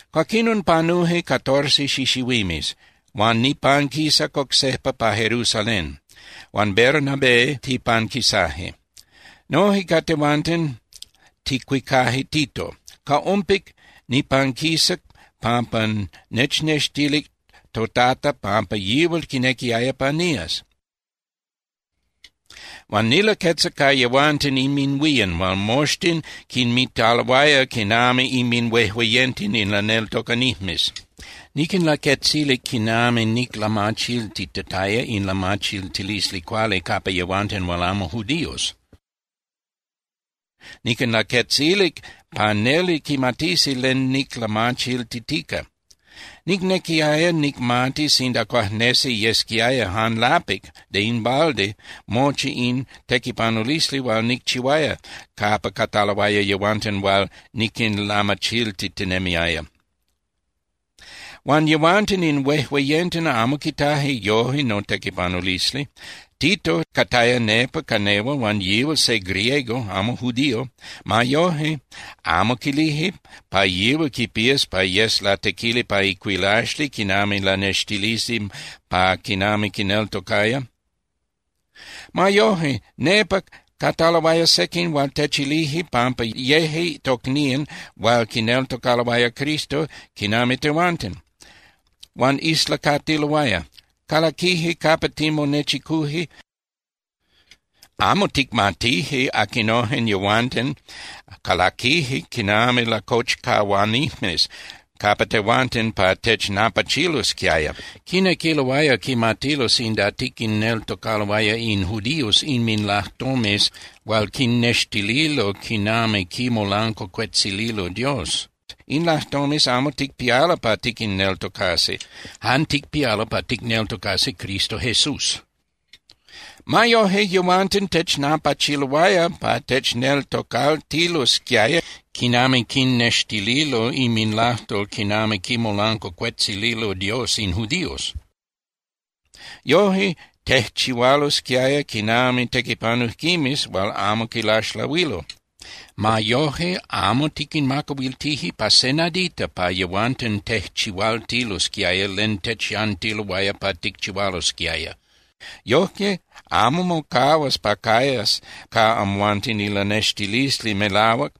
Cuaquinon panuje catorce xixihuimes, huan nipanquisac oc sejpa pa Jerusalén, huan Bernabé tipanquisaje. Noje ca tehuanten ticuicaje Tito. Ca ompic nipanquisac pampa nechnextilic toTata pampa yihual quinequiaya pa nías. Huan nilaquetzac ca yehuanten inminhuían hual moxtin quinmitaloaya quinami inminhuejueyenten in laneltocanijmes. Niquinlaquetzilic quinami niclamachiltitataya in lamachiltilisli cuali capa yehuanten hual amo judíos. Niquinlaquetzilic pa neli quimatisi len niclamachiltitica. Nicnequiaya nicmati sinda cuajnesi yesquiaya jan lapic (de in balde) mochi in tequipanulisli hual nicchihuaya capa cataloaya yehuanten hual niquinlamachiltitinemiaya. Huan yehuanten in huejueyenten amo quitaje yoje notequipanulisli. Tito cataya nepa ca nehual, huan yihual se griego, amo judío. Ma yoje, amo quilije pa yihual quipías pa yes latequili pa icuilaxli quinami lanextilisli pa quinami quineltocaya. Ma yoje, nepa cataloaya sequin hual techilije pampa yeje tocnían hual quineltocaloaya Cristo quinami tehuanten. Huan islacatiloaya. Calaquije capa timonechicuje, amo ticmatije aquinojen yehuanten, calaquije quinami lacochcahuanijmes capa tehuanten pa technapachilosquiaya. Quinequiloaya quimatilo sinda tiquinneltocaloaya in judíos inminlajtomes hual quinnextililo quinami quimolancuacuetzililo Dios. In lajtomes amo ticpialo pa tiquinneltocasi, jan ticpialo pa ticneltocasi Cristo Jesús. Ma yoje, yehuanten technapachiloaya pa techneltocaltilosquiaya quinami quinnextililo inminlajtol quinami quimolancuacuetzililo Dios in judíos. Yoje tejchihualosquiaya quinami tequipanujquimes hual amo quilaxlahuilo. Ma yoje, amo tiquinmacahuiltije pa se nadita pa yehuanten tejchihualtilosquiaya len techyantiloaya pa ticchihualosquiaya. Yojque amo mocahuas pa cayas ca amhuanten ilanextilisli melahuac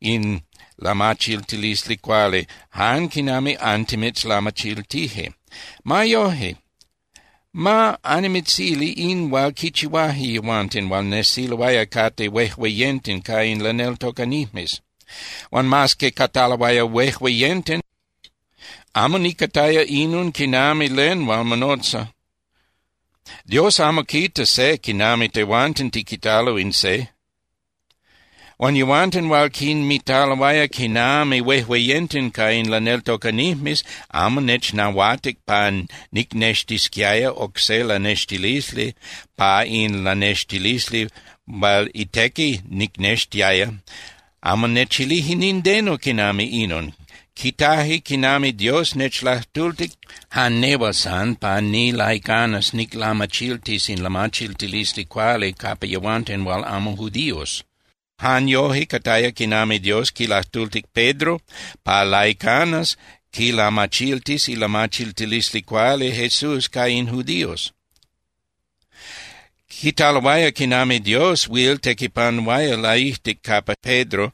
in lamachiltilisli cuali jan quinami antimitzlamachiltije. Ma yoje, ma annimitzili in hual quichihuaje yehuanten hual nesiloaya cate huejueyenten ca in laneltocanijmes. Huan mas que cataloaya huejueyenten, amo niquitaya inon quinami len hual monotza. Dios amo quita se quinami tehuanten tiquitalo in se. Huan yehuanten hual quinmitaloaya quinami huejueyenten ca in laneltocanijmes amo nechnahuatic pa nicnextisquiaya oc se lanextilisli pa in lanextilisli hual itequi nicnextiaya. Amo nechilije nindeno quinami inon. Quitaje quinami Dios nechlajtultic jan nehual san pa nilaicanas niclamachiltis in lamachiltilisli cuali capa yehuanten hual amo judíos. Jan yoje cataya quinami Dios quilajtultic Pedro pa laicanas quilamachiltis ilamachiltilisli cuali Jesús ca in judíos. Quitaloaya quinami Dios huil tequipanuaya laijtic capa Pedro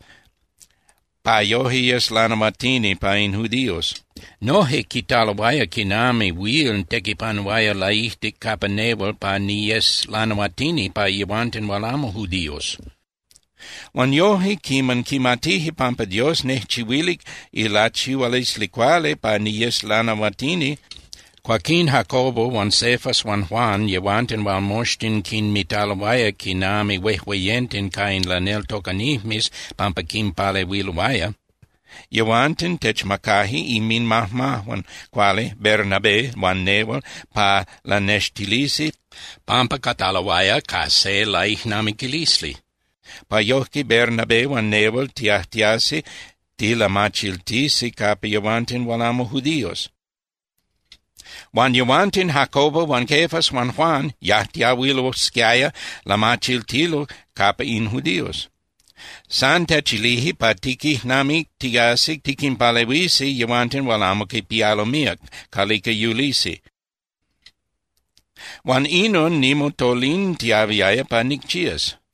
pa yoje yes lanahuatini pa in judíos. Noje quitaloaya quinami huil tequipanuaya laijtic capa nehual pa niyes lanahuatini pa yehuanten hual amo judíos. Huan yoje, quiman quimatije pampa Dios nejchihuilic ilachihualisli cuali pa niyes lanahuatini, cuaquín Jacobo huan Cefas huan Juan, yehuanten hual moxtin quinmitaloaya quinami huejueyenten ca in laneltocanijmes pampa quinpalehuiloaya, yehuanten techmacaje inminmajmajuan cuali Bernabé huan nehual pa lanextilisi pampa cataloaya ca se laijnamiquilisli, pa yojque Bernabé huan nehual tiajtiasi tilamachiltisi capa yehuanten hual amo judíos. Huan yehuanten, Jacobo huan Cefas huan Juan yajtiahuilosquiaya lamachiltilo capa in judíos. San techilije pa tiquijnamictiasi tiquinpalehuisi yehuanten hual amo quipialo míac calica yulisi, huan inon nimotolintiahuiaya pa nicchías.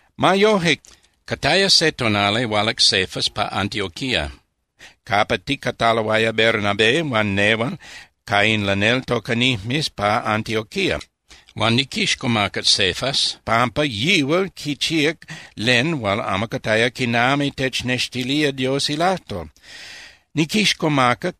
Ma yoje, cataya se tonali hualac Cefas pa Antioquía capa ticataloaya Bernabé huan nehual ca in laneltocanijmes pa Antioquía. Huan niquixcomacac Cefas pampa yihual quichíac len hual amo cataya quinami technextilía Dios ilajtol. Niquixcomacac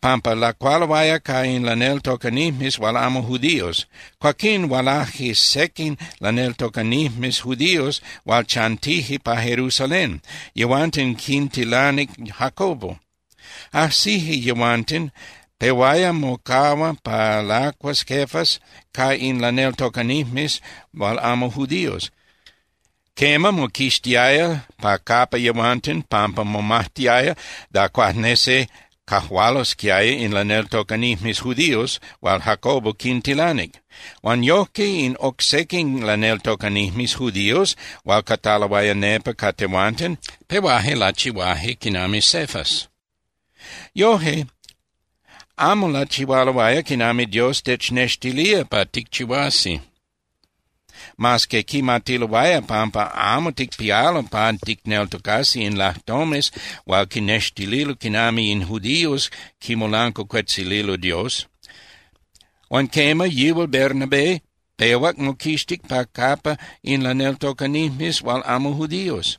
pampa lacualoaya ca in laneltocanijmes hual amo judíos. Cuaquín hualaje sequin laneltocanijmes judíos hual chantije pa Jerusalén, yehuanten quintilanic Jacobo. Ajsije yehuanten, pehuaya mocahua pa lacuas Cefas ca in laneltocanijmes hual amo judíos. Quema, moquixtiaya pa capa yehuanten pampa momajtiaya da cuajnesi cajualosquiaya in laneltocanijmes judíos hual Jacobo quintilanic. Huan yojque, in oc sequin laneltocanijmes judíos hual cataloaya nepa ca tehuanten, pehuaje lachihuaje quinami Cefas. Yoje, amo lachihualoaya quinami Dios technextilía pa ticchihuasi, mas que quimatiloaya pampa amo ticpialo pa ticneltocasi in lajtomes hual quinnextililo quinami in judíos quimolancuacuetzililo Dios. Huan quema, yihual Bernabé pehuac moquixtic pa capa in laneltocanijmes hual amo judíos.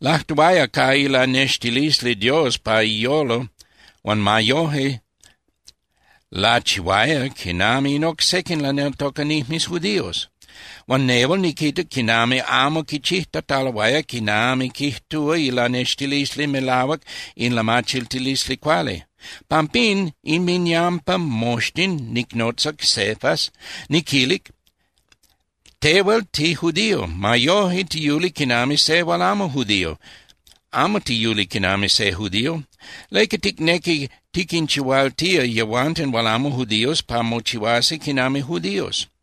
Lajtuaya ca ilanextilisli Dios pa iyolo huan ma yoje lachihuaya quinami in oc sequin laneltocanijmes judíos. Huan nehual niquitac quinami amo quichijtataloaya quinami quijtúa ilanextilisli melahuac in lamachiltilisli cuali. Pampín inminyampa moxtin, nicnotzac Cefas, niquilic: “Tehual tijudío. Ma yoje tiyuli quinami se hual amo judío, amo tiyuli quinami se judío. ¿Leca ticnequi tiquinchihualtía yehuanten hual amo judíos pa mochihuasi quinami judíos?”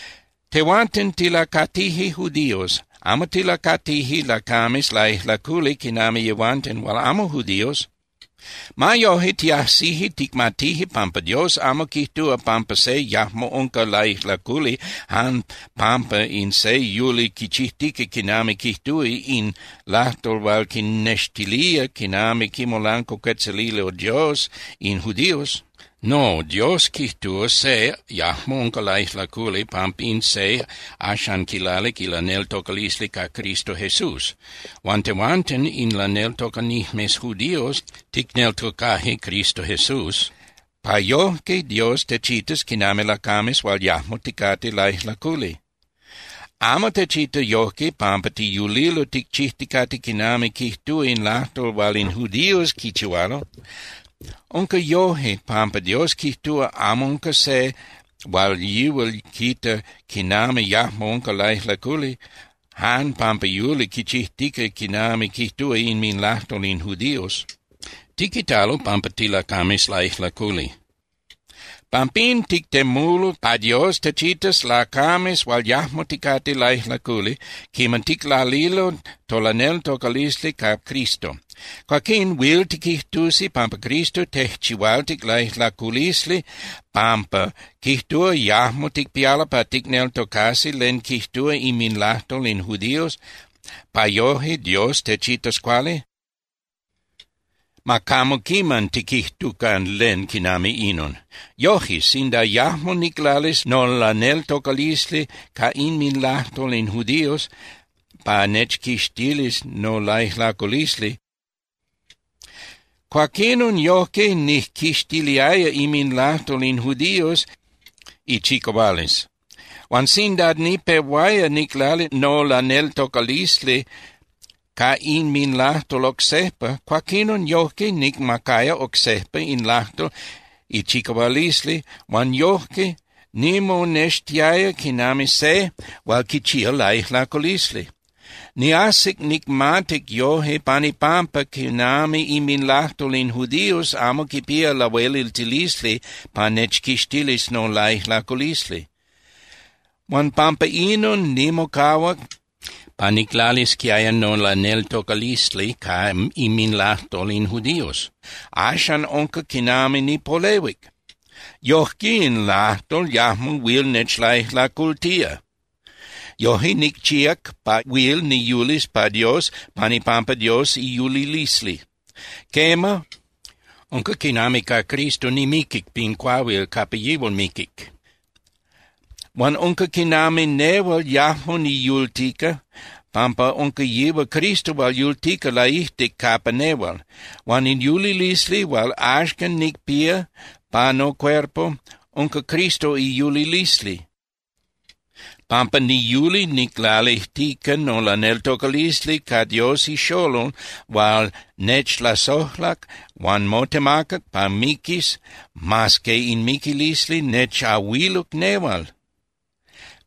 Tehuanten tilacatije judíos, amo tilacatije lacames laijlaculi quinami yehuanten hual amo judíos. Ma yoje, tiajsije ticmatije pampa Dios amo quijtúa pampa se yajmo unca laijlaculi jan pampa in se yuli quichijtica quinami quijtúa in lajtol hual quinnextilía quinami quimolancuacuetzililo Dios in judíos. No, Dios quijtúa se yajmo unca laijlaculi pampa in se axan quilalic ilaneltocalisli ca Cristo Jesús. Huan tehuanten in laneltocanijmes judíos, ticneltocaje Cristo Jesús pa yojque Dios techitas quinami lacames hual yajmo ticate laijlaculi. Amo techita yojque pampa tiyulilo ticchijticate quinami quijtúa in lajtol hual in judíos quichihualo. Unca yoje, pampa Dios quijtúa amo unca se hual yihual quita quinami yajmo unca laijlaculi jan pampa yuli quichijtica quinami quijtúa inminlajtol in judíos. Tiquitalo pampa tilacames laijlaculi. Pampín tictemulo pa Dios techitas lacames hual yajmo ticate laijlaculi quiman ticlalilo tolaneltocalisli ca Cristo. Cuaquín ¿huil tiquijtusi pampa Cristo tejchihualtic laijlaculisli pampa quijtúa yajmo ticpialo pa ticneltocasi len quijtúa inminlajtol in judíos pa yoje Dios techitas cuali? ¡Ma camo quiman tiquijtucan len quinami inon! Yoje, sinda yajmo niclalis nolaneltocalisli ca inminlajtol in judíos pa nechquixtilis nolaijlaculisli, cuaquinon, yojque nijquixtiliaya inminlajtol in judíos ichicahualisli. Huan sinda nipehuaya niclali nolaneltocalisli ca inminlajtol oc sejpa, cuaquinon yojque nicmacaya oc sejpa in lajtol ichicahualisli huan yojque nimonextiaya quinami se hual quichía laijlaculisli. Niajsic nicmatic yoje pan ipampa quinami inminlajtol in judíos amo quipía lahueliltilisli pa nechquixtilis nolaijlaculisli. Huan pampa inon nimocahuac pa niclalisquiaya nolaneltocalisli ca inminlajtol in judíos. Axan unca quinami nipolehuic, yoje in lajtol yajmo huil nechlaijlacultía. Yoje nicchíac pa huil niyulis pa Dios pan ipampa Dios iyulilisli. Quema, unca quinami ca Cristo nimiquic pin cuahuil capa yihual miquic. Huan unca quinami nehual yajmo niyultica, pampa unca yihual Cristo hual yultica laijtic capa nehual. Huan in yulilisli hual axcan nicpía pa nocuerpo unca Cristo iyulilisli, pampa niyuli niclalijtica nolaneltocalisli ca Dios iXolol hual nechlasojlac huan motemacac pa miquis mas que in miquilisli nechahuiluc nehual.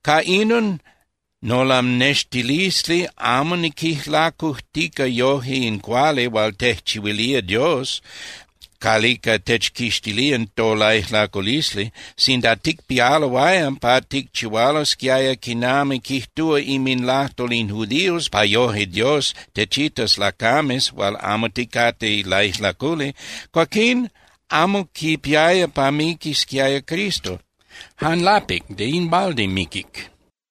Ca inon nolanextilisli amo niquijlacujtica yoje in cuali hual tejchihuilía Dios calica techquixtilía tolaijlaculisli. Sinda ticpialoaya pa ticchihualosquiaya quinami quijtúa inminlajtol in judíos pa yoje Dios techitas lacames hual amo ticate laijlaculi, cuaquín amo quipiaya pa miquisquiaya Cristo, jan lapic (de in balde) miquic.